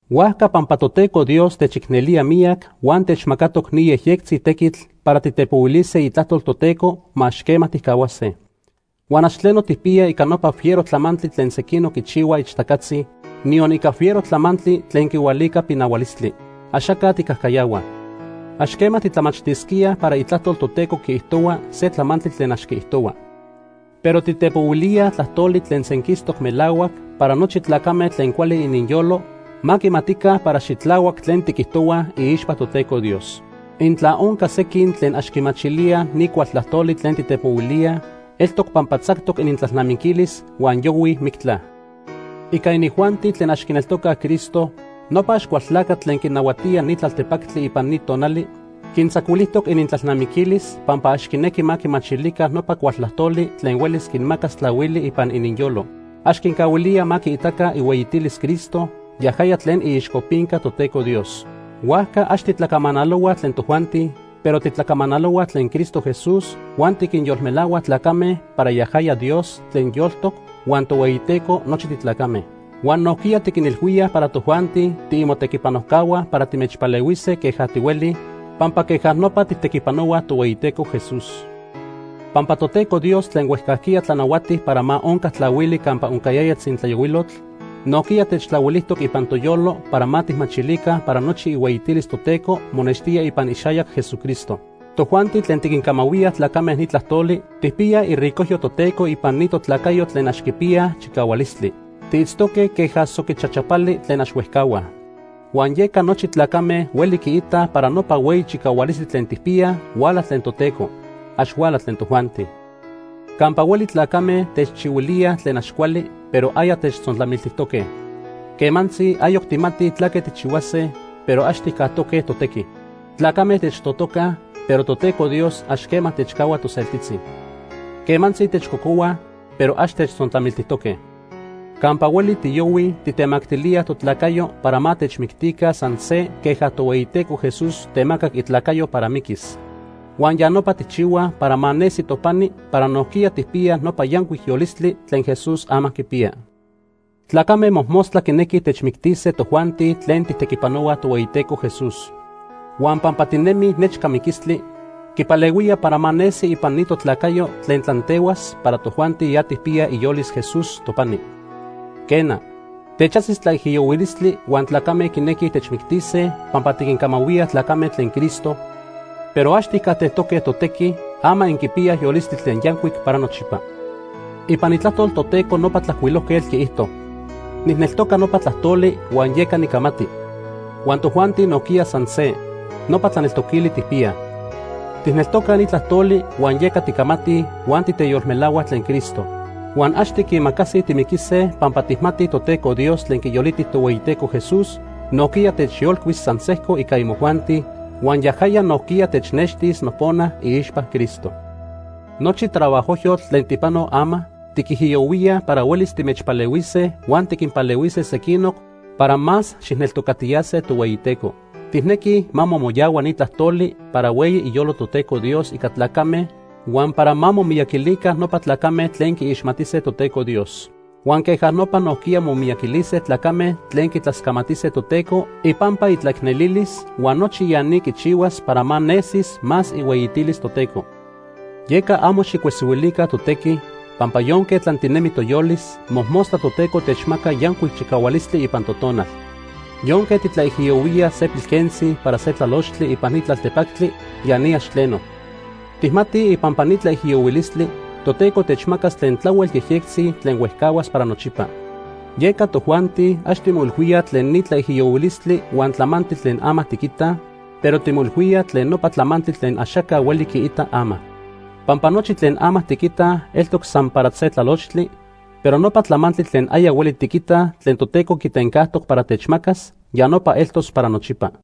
Huajca pampa Toteco Dios techicnelía miyac huan techmacatoc ni yejyectzi tequitl para titepohuilise itlajtol Toteco, ma ax quema tijcahuase. Huan ax tleno tijpiyaj ica nopa fiero tlamantli tlen sequinoc quichihuaj ixtacatzi, niyon ica fiero tlamantli tlen quihualica pinahualistli. Axaca tijcajcayahuaj. Ax quema titlamachtisquíaj para Itlajtol Toteco quiijtohua se tlamantli tlen ax quiijtohua. Pero titepohuilíaj tlajtoli tlen senquistoc melahuac para nochi tlacame tlen cuali ininyolo ma quimatica para xitlahuac tlen tiquijtohuaj iixpa Toteco Dios. Intla onca sequin tlen ax quimachilíaj ni cual tlajtoli tlen titepohuilíaj, eltoc pampa tzactoc inintlalnamiquilis huan yohuij mictla. Ica inijuanti tlen ax quineltocaj Cristo, nopa Axcualtlacatl tlen quinahuatía ni tlaltepactli ipan ni tonali, quintzacuilijtoc inintlalnamiquilis pampa ax quinequi ma quimachilica nopa cual tlajtoli tlen huelis quinmacas tlahuili ipan ininyolo. Ax quincahuilía ma quiitaca ihueyitilis Cristo yajaya tlen iixcopinca Toteco Dios. Huajca ax titlacamanalohuaj tlen tojuanti, pero titlacamanalohuaj tlen Cristo Jesús huan tiquinyolmelahuaj tlacame para yajaya Dios tlen yoltoc huan Tohueyiteco nochi titlacame. Huan nojquiya tiquinilhuíaj para tojuanti tiimotequipanojcahua para timechpalehuise queja tihuelij, pampa queja nopa tijtequipanohuaj Tohueyiteco Jesús. Pampa Toteco Dios tlen huejcajquiya tlanahuati para ma onca tlahuili campa oncayaya tzintlayohuilotl, nojquiya techtlahuilijtoc ipan toyolo para ma tijmachilica para nochi ihueyitilis Toteco monextía ipan ixayac Jesucristo. Tojuanti tlen tiquincamahuía tlacame ni tlajtoli tijpiyaj iricojyo Toteco ipan ni totlacayo tlen ax quipiyaj chicahualistli. Tiitztoque queja soquichachapali tlen ax huejcahuaj. Huan yeca nochi tlacame hueli quiitaj para nopa hueyi chicahualistli tlen tijpiyaj, huala tlen Toteco. Ax huala tlen tojuanti. Campa hueli tlacame techchihuilíaj tlen ax cuali, pero aya techtzontlamiltijtoque. Quemantzi ayoc tijmatij tlaque tijchihuase, pero ax tijcajtoque totequi. Tlacame techtotocaj, pero Toteco Dios ax quema techcahua toseltitzi. Quemantzi techcocohuaj, pero ax techtzontlamiltijtoque. Campa hueli tiyohuij tijtemactilíaj totlacayo para ma techmictica san se queja Tohueyiteco Jesús temacac itlacayo para miquis. Huan ya nopa tijchihuaj para ma nesi topani para nojquiya tijpiyaj nopa yancuic yolistli tlen Jesús ama quipiya. Tlacame mojmostla quinequij techmictise tojuanti tlen tijtequipanohuaj Tohueyiteco Jesús. Huan pampa tinemij nechca miquistli, quipalehuía para ma nesi ipan ni totlacayo tlen tlantehuas para tojuanti ya tijpiyaj iyolis Jesús topani. Quena, techajsi tlaijiyohuilistli huan tlacame quinequij techmictise pampa tiquincamahuía tlacame tlen Cristo, pero ax tijcajtejtoque totequi, ama inquipiyaj yolistli tlen yancuic para nochipa. Ipan Itlajtol Toteco nopa tlajcuilojquetl quiijto: “Nijneltoca nopa tlajtoli huan yeca nicamati.” Huan tojuanti nojquiya san se nopa tlaneltoquili tijpiyaj. Tijneltocaj ni tlajtoli huan yeca ticamatij huan titeyolmelahuaj tlen Cristo. Huan ax tiquimacasij timiquise pampa tijmatij Toteco Dios tlen quiyoliti Tohueyiteco Jesús, nojquiya techyolcuis san sejco ica imojuanti, huan yajaya nojquiya technextis nopona iixpa Cristo. Nochi trabajojyotl tlen tijpanoj ama, tiquijiyohuíaj para huelis timechpalehuise huan tiquinpalehuise sequinoc para más xijneltocatiyase Tohueyiteco. Tijnequij ma momoyahua ni tlajtoli para hueyi iyolo Toteco Dios ica tlacame huan para ma momiyaquilica nopa tlacame tlen quiixmatise Toteco Dios. Huan queja nopa nojquiya momiyaquilise tlacame tlen quitlascamatise Toteco ipampa itlaicnelilis, huan nochi ya ni quichihuas para ma nesis más ihueyitilis Toteco. Yeca amo xijcuesihuilica totequi, pampa yonque tlantinemi toyolis, mojmostla Toteco techmaca yancuic chicahualistli ipan totonal. Yonque titlaijiyohuíaj se pilquentzi para se tlalochtli ipan ni tlaltepactli, ya ni ax tleno. Tijmatij ipampa ni tlaijiyohuilistli, Toteco techmacas tlen tlahuel yejyectzi tlen huejcahuas para nochipa. Yeca tojuanti ax timoilhuíaj tlen ni tlaijiyohuilistli huan tlamantli tlen ama tiquitaj, pero timoilhuíaj tlen nopa tlamantli tlen axaca hueli quiita ama. Pampa nochi tlen ama tiquitaj eltoc san para se tlalochtli, pero nopa tlamantli tlen aya hueli tiquitaj tlen Toteco quitencajtoc para techmacas, ya nopa eltos para nochipa.